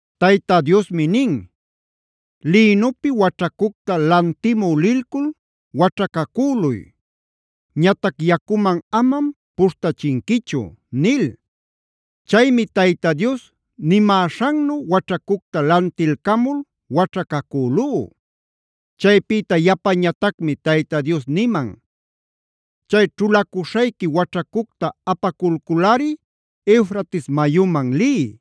Tayta Diosmi nin: “Lïnupi waćhacucta lantimü lilcul waćhacacüluy. Ñatac yacuman amam puśhtachinquichu” nil. Chaymi Tayta Dios nimäśhannu waćhacucta lantilcamul waćhacacülú. Chaypïta yapañatacmi Tayta Dios niman: “Chay ćhulacuśhayqui waćhacucta apaculculꞌari Eufrates mayuman liy.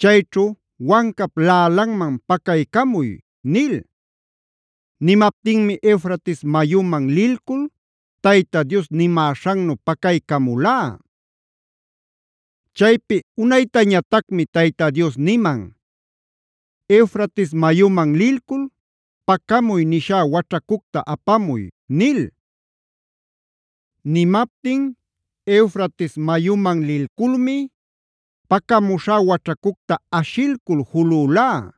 Chayćhu wancap laꞌalanman pacaycamuy” nil. Nimaptinmi Eufrates mayuman lilcul Tayta Dios nimäśhannu pacaycamulá. Chaypi unaytañatacmi Tayta Dios niman: “Eufrates mayuman lilcul pacamuy nishá waćhacucta apamuy” nil. Nimaptin Eufrates mayuman lilculmi pacamuśhá waćhacucta aśhilcul julülá.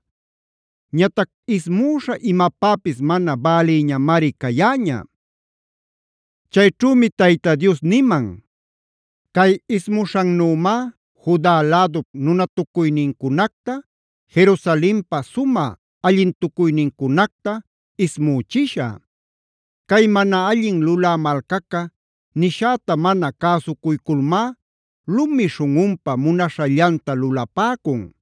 Ñatac ismüśha imapäpis mana bälïñamari cayäña. Chayćhümi Tayta Dios niman: “Cay ismuśhannümá Juda lädup nunatucuynincunacta, Jerusalenpa sumä allintucuynincunacta ismüchishä. Cay mana allin lulä malcaca nishäta mana cäsucuyculmá lumi śhunꞌunpa munaśhallanta lulapäcun.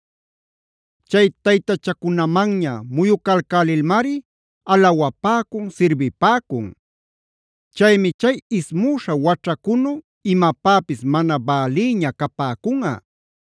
Chay taytachacunamanña muyucalcälilmari alawapäcun, sirbipäcun. Chaymi chay ismüśha waćhacunu imapäpis mana bälïña capäcunꞌa.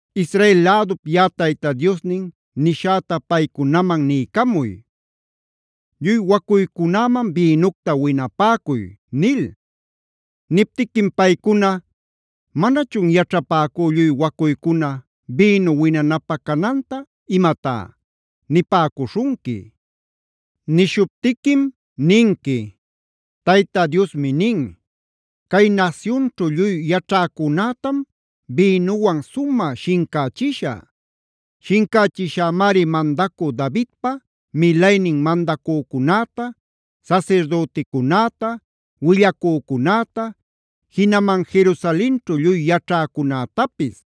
“Israel lädup yaꞌa Tayta Diosnin nishäta paycunaman niycamuy: ‘Lluy wacuycunäman bïnucta winapäcuy’ nil. Niptiquim paycuna: ‘¿Manachun yaćhapäcú lluy wacuycuna bïnu winanapä cananta imatá?’ nipäcuśhunqui. “Nishuptiquim ninqui: ‘Tayta Diosmi nin: Cay nasyunćhu lluy yaćhäcunätam bïnuwan sumä shincächishä. Shincächishämari mandacü Davidpa milaynin mandacücunäta, sasirdüticunäta, willacücunäta, jinaman Jerusalenćhu lluy yaćhäcunätapis.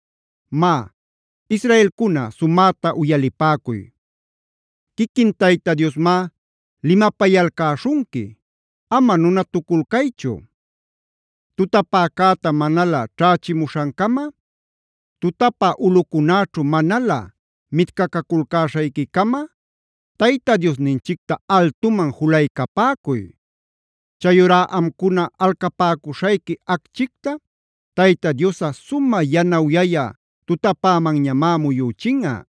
Má, ¡Israelcuna, sumäta uyalipäcuy! Quiquin Tayta Diosmá limapayalcäśhunqui; ama nunatuculcaychu. Tutapäcäta manalä ćhächimuśhancama, tutapä ulꞌucunäćhu manalä mitcaculcäśhayquicama Tayta Diosninchicta altuman juluycapäcuy. Chayurá amcuna alcapäcuśhayqui acchicta Tayta Diosꞌa sumä yanawyayä tutapämanñamá muyüchinꞌa.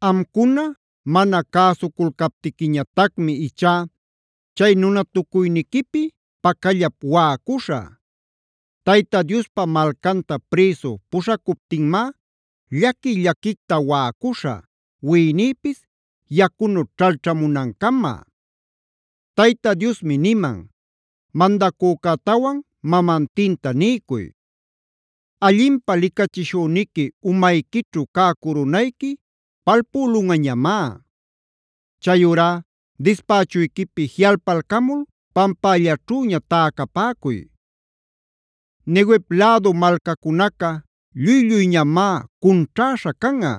Amcuna mana cäsuculcaptiquiñatacmi ichá chay nunatucuyniquipi pacallap waꞌacuśhä. Tayta Diospa malcanta prïsu puśhacuptinmá llaqui-llaquicta waꞌacuśhä, wiꞌinïpis yacunu ćhalćhamunancama. Tayta Diosmi niman: “Mandacücätawan mamantinta niycuy: ‘Allinpä licachishüniqui umayquićhu cä curunayqui palpülunꞌañamá. Chayurá dispächuyquipi jiꞌalpalcamul pampällaćhüña täcapäcuy. Neguev lädu malcacunaca lluy-lluyñamá cunćhäśha canꞌa.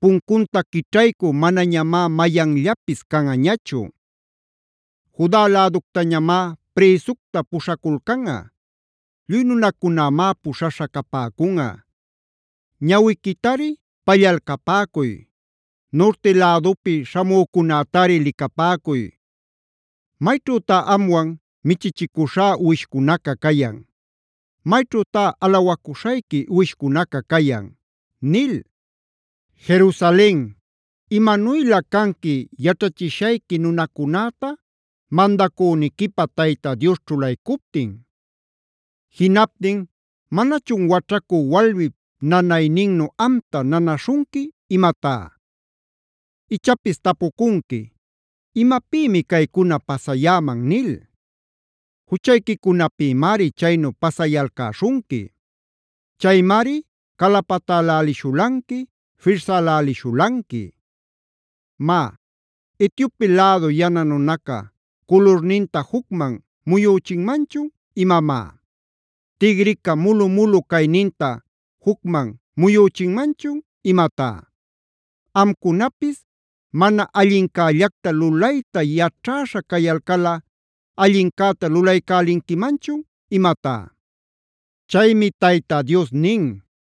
Puncunta quićhaycü manañamá mayanllapis canꞌañachu. Juda läductañamá prïsucta puśhaculcanꞌa; lluy nunacunamá puśhaśha capäcunꞌa. Ñawiquitari pallalcapäcuy; nurti lädupi śhamücunätari licapäcuy. ¿Mayćhütá amwan michichicuśhá uwishcunaca cayan? ¿Mayćhütá alawacuśhayqui uwishcunaca cayan?’” nil. Jerusalen, ¿imanuylä canqui yaćhachishayqui nunacunäta mandacüniquipä Tayta Dios ćhulaycuptin? Jinaptin ¿manachun waćhacü walmip nanayninnu amta nanaśhunqui imatá? Ichapis tapucunqui: “¿Imapïmi caycuna pasayäman?” nil. Juchayquicunapïmari chaynu pasayalcäśhunqui. Chaymari calapatälälishulanqui, firsälälishulanqui. Má, ¿Etiope lädu yana nunaca culurninta jucman muyüchinmanchun imamá? ¿Tigrica mulu-mulu cayninta jucman muyüchinmanchun imatá? Amcunapis ¿mana allincällacta lulayta yaćhäśha cayalcalꞌa allincäta lulaycälinquimanchun imatá? Chaymi Tayta Dios nin: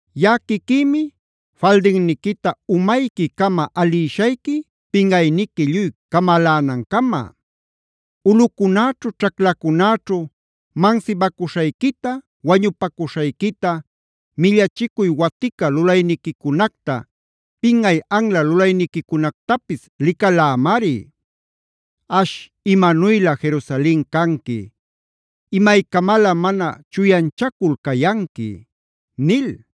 “Yaꞌa quiquïmi faldinniquita umayquicama alïshayqui pinꞌayniqui lluy camalänancama. Ulꞌucunäćhu ćhaclacunäćhu mansibacuśhayquita, wañupacuśhayquita, millachicuy watica lulayniquicunacta, pinꞌay anla lulayniquicunactapis licalämari. ¡Ash, imanuylä Jerusalen canqui! ¿Imaycamalä mana chuyanchacul cayanqui?” nil.